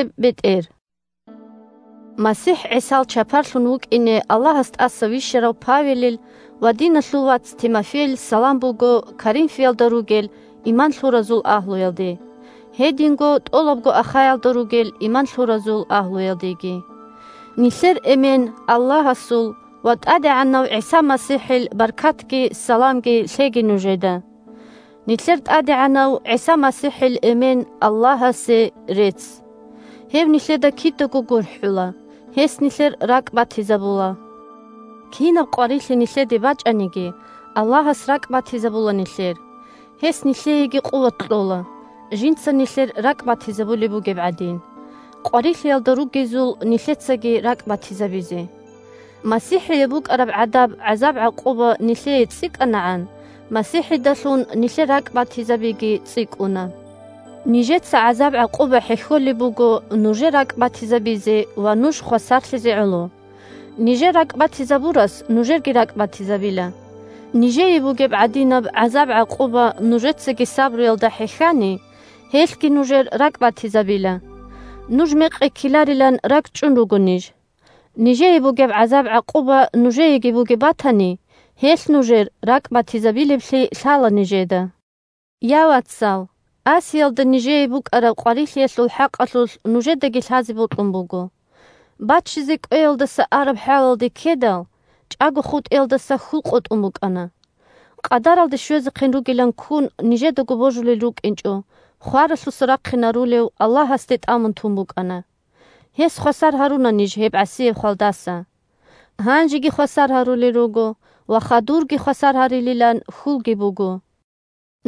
бетӀер Саламалъул рагӀаби 1МасихӀ ГӀисал чапарлъун вукӀине Аллагьас тӀаса вищарав Павелил ва диналъул вац Тимофейил салам буго Коринфалда ругел иман лъуразул агьлуялде, гьединго тӀолабго Ахаялда ругел иман лъуразул агьлуялдеги. Нилъер Эмен – Аллагьасул ва ТӀадегӀанав ГӀиса МасихӀил баркатги саламги лъеги нужеда. Нилъер ТӀадегӀанав ГӀиса МасихӀил Эмен – Аллагьасе рецц! Гьев нилъеда кидаго гурхӀула, гьес нилъер ракӀбатизабула! Кинаб къварилъи нилъеде бачӀаниги, Аллагьас ракӀбатизабула нилъер. Гьес нилъееги къуват кьола, – жинца нилъер ракӀбатизабулеб бугеб гӀадин, къварилъиялда ругезул нилъецаги ракӀбатизабизе. МасихӀие букӀараб гӀадаб гӀазаб-гӀакъуба нилъее цӀикӀкӀанагӀан, МасихӀидалъун нилъер ракӀбатизабиги цӀикӀкӀуна. Нижеца гӀазаб-гӀакъуба хӀехьолеб буго нужер ракӀбатизабизе ва нуж хвасарлъизе гӀоло. Нижер ракӀбатизабурас нужерги ракӀбатизабила. Нижее бугеб гӀадинаб гӀазаб-гӀакъуба нужецаги сабруялда хӀехьани, гьелъги нужер ракӀбатизабила. Нуж мекъи ккеларилан ракӀчӀун руго ниж. Нижее бугеб гӀазаб-гӀакъуба нужееги бугеб батани, гьелъ нужер ракӀбатизабилеблъи лъала нижеда. Я, вацал, Асиялда нижее букӀараб къварилъиялъул хӀакъалъулъ нужедаги лъазе бокьун буго. Баччизе кӀвеялдаса араб хӀалалде ккедал, чӀаго хутӀиялдаса хьул къотӀун букӀана. Къадаралде щвезехъин ругилан ккун, нижедаго божулел рукӀинчӀо, хваралъуса рахъинарулев Аллагьасде тӀамун тун букӀана. Гьес хвасар гьаруна ниж гьеб гӀасияб хвалдаса. Гьанжеги хвасар гьарулел руго, ва хадурги хвасар гьарилилан хьулги буго.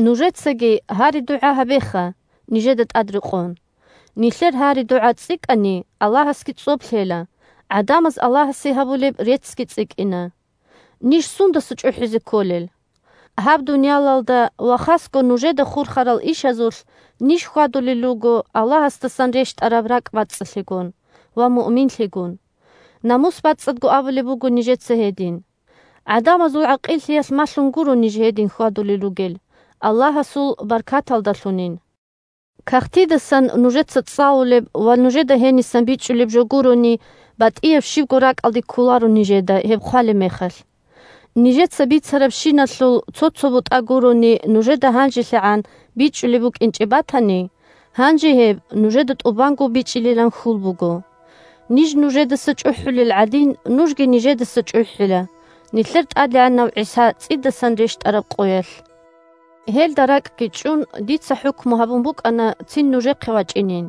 Нужецаги гьари-дугӀа гьабеха, нижеда тӀадрекъон. Нилъер гьари-дугӀа цӀикӀкӀани, Аллагьасги цӀоб лъела, гӀадамаз Аллагьасе гьабулеб реццги цӀикӀкӀина. Ниж сундаса чӀухӀизе кколел? Гьаб дуниялалда ва хасго нужеда хурхарал ишазулъ ниж хьвадулел руго Аллагьасдасан рещтӀараб ракӀбацӀцӀалъигун ва муъминлъигун. Намус бацӀцӀадго абулеб буго нижеца гьедин. ГӀадамазул гӀакъиллъиялъ малъун гуро ниж гьедин хьвадулел ругел, Аллагьасул баркаталдалъунин. Кагътидасан нужеца цӀалулеб ва нужеда гьенисан бичӀчӀулеб жо гурони, батӀияб щибго ракӀалде кколаро нижеда гьеб хъвалеб мехалъ. Нижеца бицарабщиналъул цо-цо бутӀа гурони нужеда гьанжелъагӀан бичӀчӀулеб букӀинчӀеб батани, гьанже гьеб нужеда тӀубанго бичӀчӀилилан хьул буго. Ниж нужедаса чӀухӀулел гӀадин, нужги нижедаса чӀухӀила – нилъер ТӀадегӀанав ГӀиса цӀидасан рещтӀараб къоялъ. Гьелда ракӀги чӀун, дица хӀукму гьабун букӀана цин нужехъе вачӀинин,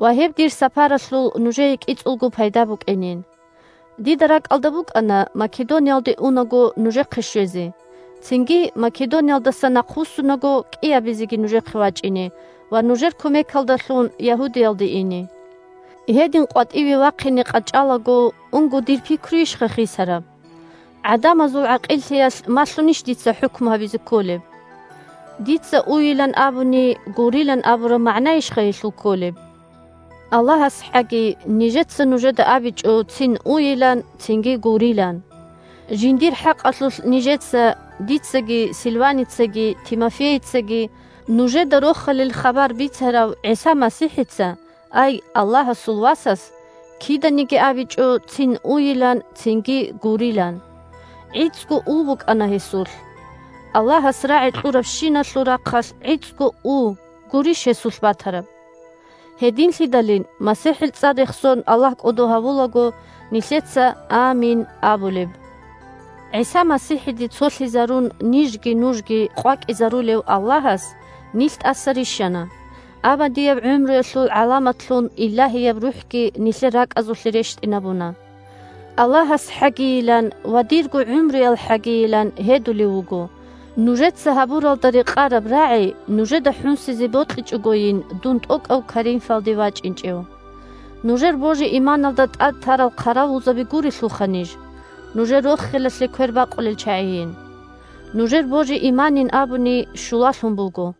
ва гьеб дир сапаралъул нужее кӀицӀулго пайда букӀинин. Дида ракӀалда букӀана Македониялде унаго нужехъе щвезе, цинги Македониялдаса нахъвуссунаго кӀиабизеги нужехъе вачӀине ва нужер кумекалдалъун Ягьудиялде ине. Гьедин къватӀиве вахъине къачӀалаго унго дир пикруйищха хисараб? ГӀадамазул гӀакъиллъиялъ малъунищ дица хӀукму гьабизе кколеб? Дица «уйилан» абуни, «гурилан» абураб магӀнайищха гьелъул кколеб? АллагьасхӀаги, нижеца нужеда абичӀо цин «уйилан», цинги «гурилан». Жиндир хӀакъалъулъ нижеца – дицаги, Сильваницаги, Тимофейицаги – нужеда Рохалил хабар бицарав ГӀиса МасихӀица, ай Аллагьасул Васас, киданиги абичӀо цин «уйилан», цинги «гурилан». ГӀицӀго «у» букӀана гьесулъ. Аллагьас рагӀи кьурабщиналъул рахъалъ гӀицӀго «у» гурищ гьесулъ батараб. Гьединлъидалин, МасихӀил цӀар рехсон Аллагь кӀодо гьавулаго, нилъеца «амин» абулеб. ГӀиса МасихӀиде цолъизарун нижги нужги къвакӀизарулев Аллагьас нилъ тӀаса рищана, абадияб гӀумруялъул гӀаламатлъун Илагьияб РухӀги нилъер ракӀазулъе рещтӀинабуна. АллагьасхӀагийилан ва дирго гӀумруялхӀагийилан гьедулев вуго: нужеца гьабуралда рекъараб рагӀи нужеда хӀунсизе бокьичӀогойин дун тӀокӀав Коринфалде вачӀинчӀев. Нужер божи-иманалда тӀад тарал хъаравулзаби гурелъулха ниж, нужер рохелалъе квербакъулел чагӀийин! Нужер божи-иманин абуни, щулалъун буго.